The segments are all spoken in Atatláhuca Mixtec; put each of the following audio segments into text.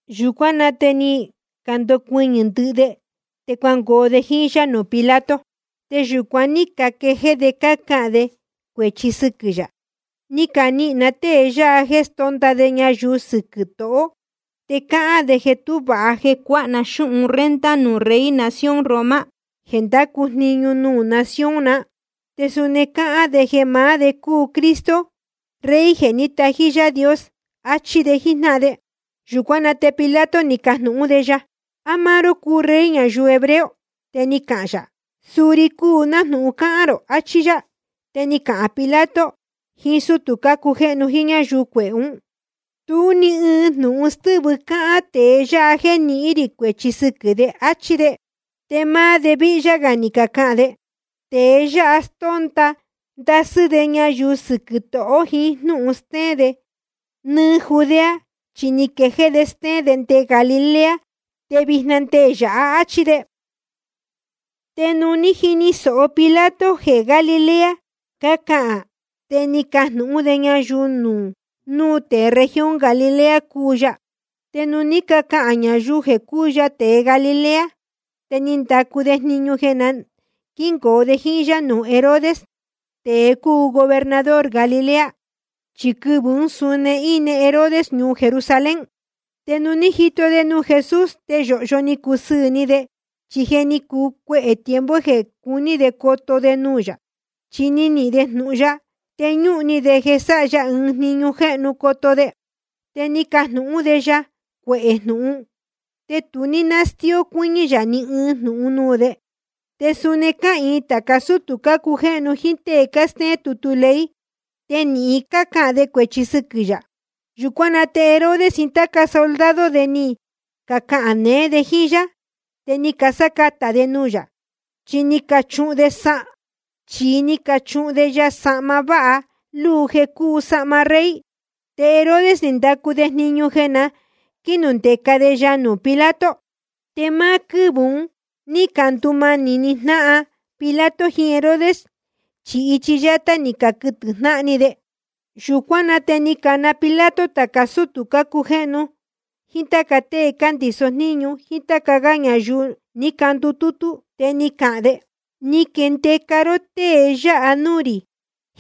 Yūcuán na te ni candocuɨñɨ̄ ndɨhɨ de, te cuangoo de jíín yá nuū Pilato. Te yūcuan ní caquejéé de cácahān de cuēchi sɨquɨ̄ yā: Ni canihīn na tée yáha jéē stónda de ñayuu sɨquɨ̄ tohō. Te cáhán de jeē tú vāha jeē cuāha ná xúhun renta nuū rey nación Roma jeē ndácu jniñu nuū nación na. Te suni cáhán de jeē maá de cúu Cristo, Rey jeē ní tají Yaā Dios. Achí de jíjnáhan de. Yūcuán na te Pilato ni cajnūhún de ya: ¿A máá ró cúu Rey ñayuu hebreo? Te ni cahān yā: Suu ri cúu, nájnūhun cáhán rō, achí yá. Te ni cahān Pilato jiín sútū cácujéhnu jíín ñáyuu cuehē ún: Tú ni ɨɨn jnūhun stɨ́vɨ cáhán tēe yáha jéē nihín rī cuēchi sɨquɨ̄ de, áchí de. Te máá de víhyá gā ni cacahān de: Tēe yáha stónda ndasɨ́ de ñayuu sɨquɨ̄ tohō jiín jnúhun stéén de nɨ́ɨ́ Judea. Chi ni quejéé de stéén de nde Galilea, te vijna te nde yāha, áchí de. Te nuū ní jini sōho Pilato jeē Galilea cácahān, te ni cajnūhún de ñayuu núu tēe región Galilea cúu ya. Te nuū ní cacahān ñayuu jeē cúu ya tēe Galilea, te ni ndacu de jniñu jeē na quíngoo de jíín yá nuū Herodes, tēe cúu gobernador Galilea. Chi quɨvɨ̄ ún suni íne Herodes ñuu Jerusalén. Te nuū ní jito de nuū Jesús, te yōhyo ni cusɨɨ̄ ni de, chi je ni cuu cuehē tiempo jeē cuní de coto de nuū yā. Chi ni nihīn de jnūhun ya, te ñúhun ni de jeē sáha ya ɨɨn jniñu jéhnu coto de. Te ni cajnūhún de ya cuehē jnūhun, te tu ní stíó cuɨ́ñɨ́ yā ni ɨɨn jnūhun nuū de. Te suni cáhīin tāca sútū cácujéhnu jíín tée cástéén tutu ley, te nīhin ni cacahān de cuēchi sɨquɨ̄ yā. Yūcuán na te Herodes jiín táca soldado de ni cacahān neé de jíín yá, te ni casácatā de nuū yā, chi ni cachuhun de ya sahma váha luu jeē cúu sahma rey. Te Herodes ni ndacu de jniñu jeē na quínundeca de ya nuū Pilato. Te máá quɨ́vɨ̄ un ní candumanī jnáhan Pilato jiín Herodes, chi ichi yátá ni caquɨtɨ̄ jnáhan ni de. Yūcuán na te ni cana Pilato tāca sútū cácujéhnu jíín táca tée cándiso jníñu jíín táca gá ñayuu, ni candutútú. Te ni cahān de: Ni caquindeca ró tée yáha núū rī,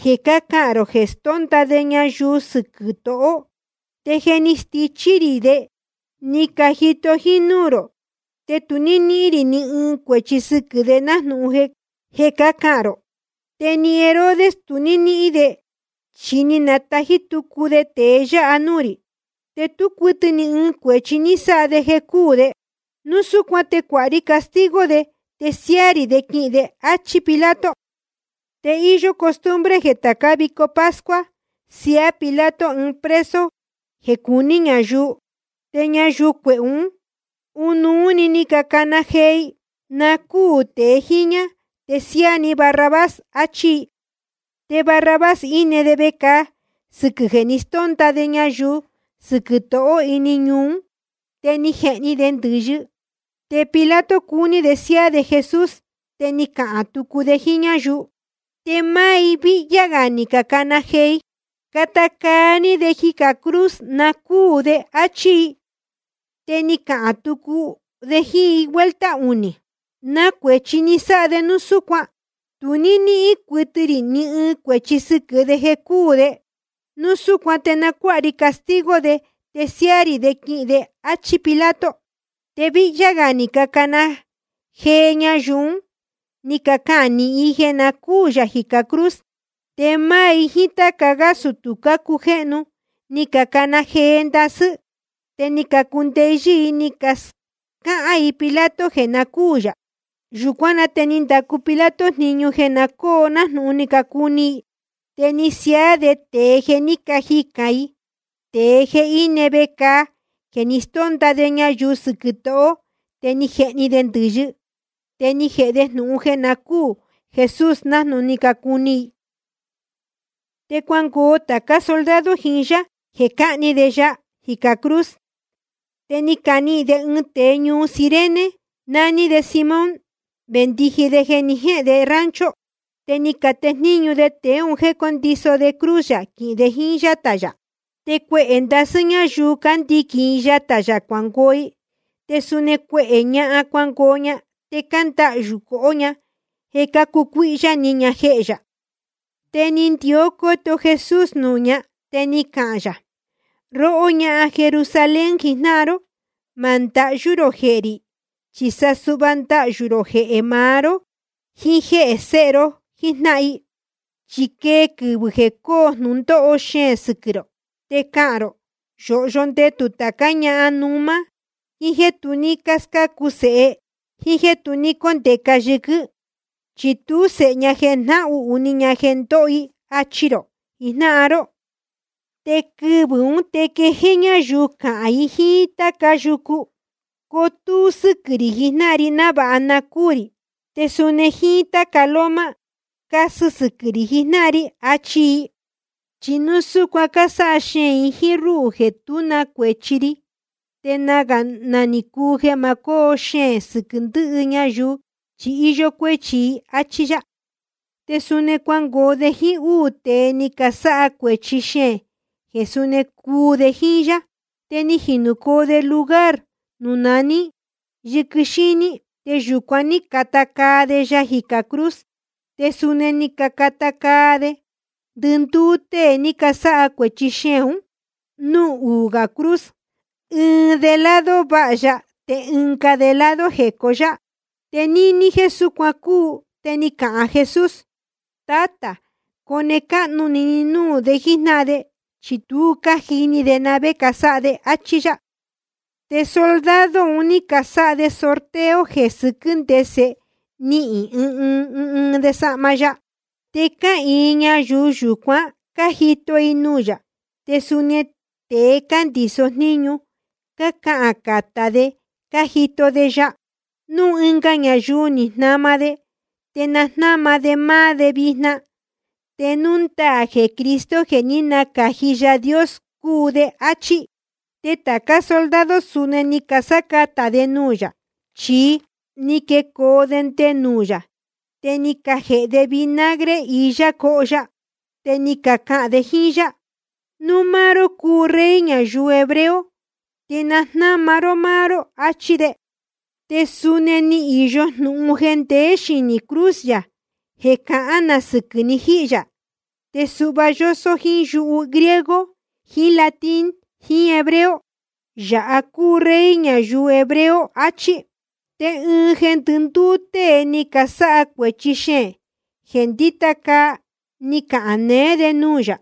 jeē cácahān rō jeē stónda de ñayuu sɨquɨ̄ tohō. Te je ni stichí rī de, ni cajito jínúū rō. Te tu ní níhín rī ni ɨɨn cuēchi sɨquɨ̄ de nájnūhun jeē cácahān rō. Te ni Herodes, tu ní níhín de, chi ni natají tucu de tēe yáha núū rī. Te tú cuɨtɨ ni ɨɨn cuēchi ní sáha de jeē cúū de. Núu súcuan te na cuáha ri castigo de, te siáá rī de quihīn de, áchí Pilato. Te íyó costumbre jeē tācá vico pascua siaá Pilato ɨɨn preso jeē cuní ñayuu. Te ñayuu cuehē ún, ɨnuú‑ni ni cacana jee i: Na cúū tēe jíñá, te siáá ní Barrabás, achí i. Te Barrabás íne de vecāa sɨquɨ̄ jeē ni stónda de ñayuu sɨquɨ̄ tohō ini ñuu ún, te ni jehni de ndɨ̄yɨ. Te Pilato cuní de siáá de Jesús, te ni cahān tucu de jíín ñáyuu. Te máá i víhyá gā ni cacana jee i: Cata caa ní de jicā cruz, na cúū de, áchí i. Te ni cahān tucu de jíín i vuelta unī: ¿Na cuēchi ni sáha de núu súcuan? Tu ní níhín cuɨtɨ rī ni ɨɨn cuēchi sɨquɨ̄ de jeē cúū de. Núu súcuan te na cuáha ri castigo de, te siáá rī de quihīn de, áchí Pilato. Te víhyá gā ni cacana jee ñayuu un, ní cacahān nīhin i jeē na cúū yā jicā cruz. Te máá i jíín táca sútū cácujéhnu, ni cacana jee ndasɨ́ i. Te ni cacundeyɨ́ i ni cascáhān i Pilato jeē na cúū yā. Yūcuán na te ni ndacu Pilato jniñu jeē na cóo nájnūhun cácuni i. Te ni siaá de tēe jeē ní cajicān i, tēe jeē íne vecāa jeē ni stónda de ñayuu sɨquɨ̄ tohō te ni jehni de ndɨ̄yɨ. Te ni jēhe de jnūhun jeē na cúū Jesús nájnūhun cácuni i. Te cuangoo tācá soldado jiín yá jeē cahni de ya jicā cruz. Te ni canihīn de ɨɨn tēe ñuu Cirene, nání de Simón, vendiji de jeē ni jéhēn de rancho. Te ni catejníñu de tēe un jéē cóndiso de cruz yā quihīn de yatā yā. Te cuehē ndasɨ́ ñáyuu ndíquín i yatā yā cuangoo i. Te suni cuehē ñahan cuangoo ña, te cándahyū cohó ña jeē cácucuíhyá ni ña jehē yā. Te ni ndió cóto Jesús nuū ña, te ni cahān yā: Róhó ñahan Jerusalén jijnáhan ró, ma ndahyú rō jehē rī, chi sa suhva ndahyū rō jehē maá ró jiín jéhē sēhe ró jíjnáhan i. Chi quee quɨvɨ̄ jeē coo jnūndóho xeēn sɨquɨ̄ rō, te cahān rō: Yōhyo ndetū tācá ñahan númá, jíín jéē tu ní scácu sēhe, jíín jéē tu ní cóndeca yɨquɨ́n, chi tú sēhe ña jeē jnahuhū ni ña jeē ndóho i, achi rō jijnáhan ró. Quɨvɨ̄ ún te quejéé ñáyuu cahān i jíín táca yucu: Cotúú sɨ́quɨ̄ rī jijnáhan ri návāha cuu rī. Te suni jíín táca loma: Casɨ sɨquɨ̄ rī jijnáhan ri, achi i. Chi núu cásáha xeēn i jíín rúhū jeē tú na cuēchi ri, te nagā ni cuu jeē ma cóo xeēn sɨquɨ̄ ndɨhɨ ñayuu chi íyó cuéchi i. Achí yá. Te suni cuangoo de jíín úū tēe ni casáha cuēchi xeēn, jeē suni cuu de jíín yá. Te ni jinūcoo de lugar nuū naní Yɨquɨ Xíní, te yūcuan ní cacata caa de ya jicā cruz. Te suni ni cacata caa de ndɨndúú tée ni casáha cuēchi xeēn un núū uū gā cruz, ɨɨn de lado váha ya, te ɨnga de lado jecó yá. Te níní jéē súcuan cúu, te ni cahān Jesús: Tátā, cone cáhnu ni ni núū de jíjnáhan de, chi tu cájini de na vé casáha de, áchí yá. Te soldado un ní casáha de sorteo jeē sɨquɨ́ ndese nihīn ɨɨn ɨɨn de sahma ya. Te cáhīin ñayuu yūcuan, cájito i nuū yā. Te suni nde tēe cándiso jníñu, cácahān catá de cájito de ya: Núu ɨnga ñayuu ni jnama de, te na jnáma de máá de vijna, te núu ndaā jeē Cristo jeē ní nacāji Yaā Dios cúu de, áchí. Te tācá soldado suni ni casácatā de nuū yā, chi ni quecoo de nde nuū yā, te ni cajēhe de vinagre iyá coho ya. Te cácahān de jíín yá: Núu máá ró cúu Rey ñayuu hebreo, te na jnáma ró máá ró, achí de. Te suni ni īyo jnūhun jeē ndeé xinī cruz yā jeē cahán na sɨquɨ̄ ni jíhī yā, te suhva yósó jíín yuhu griego jiín latín jiín hebreo: Yāha cúu Rey ñayuu hebreo, achí. Te ɨɨn jeē ndɨndúú tée ni casáha cuēchi xeēn, jeē cándita caa, ni cahān neé de nuū yā: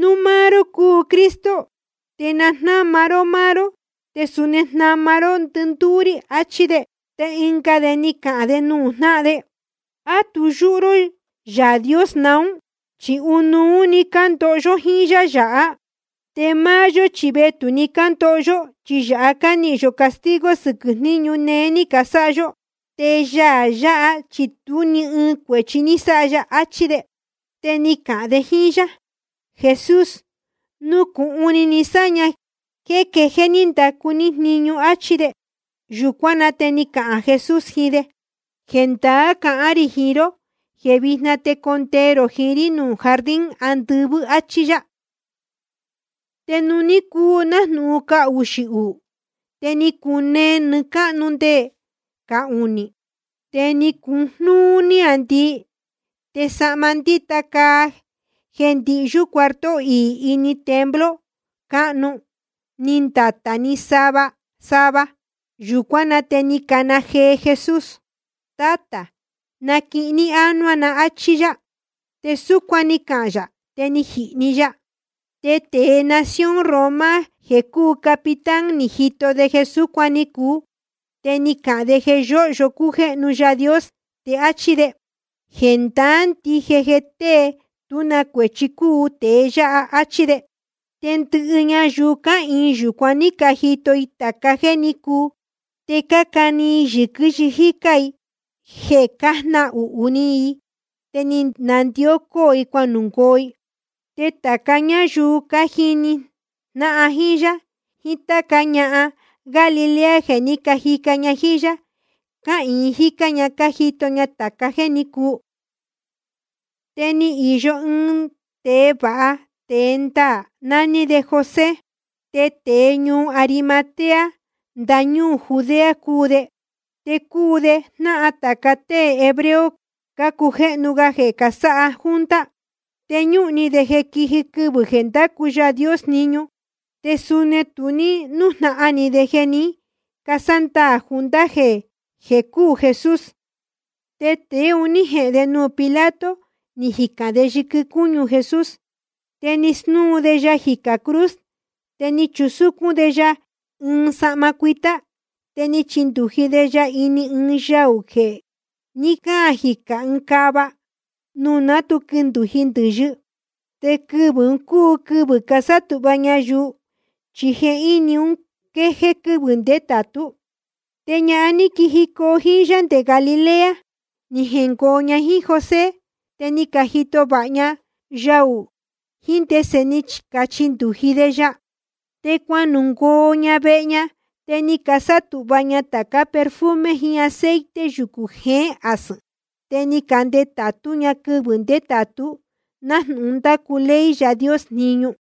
Núu máá ró cúu Cristo, te na jnáma ró máá ró te suni jnama ró ndɨndúú rí, achí de. Te ɨnga de ni cahān de nuū jnáhan de: ¿A tu yúhú ró Yaā Dios naún? Chi ɨnuú cándoho yó jíín Yaā yáha. Te máá yó chi vetū‑ni cándoho yó, chi yāha cánihīn yō castigo sɨquɨ̄ jniñu néé ní casáha yó. Te Yaā yáha chi tú ni ɨɨn cuēchi ní sáha ya, achí de. Te ni cahān de jíín yá: Jesús, nucūhun ni ni sáña jéē quéjéé ní ndacu ní jniñu, áchí de. Yūcuán na te ni cahān Jesús jiín de: Jendaá cahán rī jiín ró jeē víjna te condee rō jiín rí nuū jardín andɨvɨ́, áchí yá. Te nuū ní cuu nájnūhun cahuxī uū, te ni cunee nɨɨ́ cáhnu nde cahunī. Te ni cujnúú níāndii. Te sahma ndíta caa jeē ndihyú cuarto iī ini templo cáhnu, ni ndatā‑ni sava sava. Yūcuán na te ni cana jee Jesús: Tátā, naquihin ní ánuá na, áchí yá. Te súcuan ni cahān yā, te ni jihī‑ni ya. Te tēe nación Roma jeē cúu capitán ni jito de jeē súcuan ni cuu, te ni cahān de jeē yóhyo cújéhnu Yaā Dios, te áchí de: Jendaá ndije jeē tée tú na cuēchi cúu tēe yáha, áchí de. Te ndɨvii ñayuu cáhīin yūcuan ní cajito i tāca jéē ní cuu, te cácani i yɨ̄quɨ jícā i jeē cájnahuhū ni i, te ni nandió cóo i cuanungoo i. Te tāca ñáyuu cájini jnáhan jíín yá, jiín táca ñahan Galilea jeē ní cajica ña jíín yá, cáhīin jícá ña cájito ña tāca jéē ní cuu. Te ni īyo ɨɨn tēe vāha tēe ndaā, nání de José. Te tēe ñuu Arimatea ndañúū Judea cúu de. Te cúu de jnáhan tāca tée hebreo cácujéhnu ga jeē casáha junta. Te ñúhun ni de jeē quiji quɨvɨ̄ jeē ndacu Yaā Dios jniñu, te suni tu ní nújnahan ni de jeē ní casándaā junta un jéē cúū Jesús. Te tēe un ní jehēn de nuū Pilato, ni jicān de yɨquɨ cúñu Jesús. Te ni snúu de ya jicā cruz, te ni chusúcún de ya ɨɨn sahma cuitá. Te ni chindūji de ya ini ɨɨn yaū jeē ní caan jicā ɨɨn cava, nuū ná tu quindūji ndɨ̄yɨ. Te quɨvɨ̄ un cúu quɨvɨ̄ casátūhva ñayuu, chi jehíni un quéjéé quɨ́vɨ̄ ndétātú. Te ñahan ní quijicoo jíín yá nde Galilea, ni jengoo ña jíín José, te ni cajito vāha ña yaū ún, jíín ndese ni cachindūji de ya. Te cuanungoo ña vehe ña, te ni casátūhva ña tācá perfume jiín aceite yucū jeén asɨ̄n. Te ni candetātú ña quɨvɨ̄ ndétātú, nájnūhun ndácu ley Yaā Dios jniñu.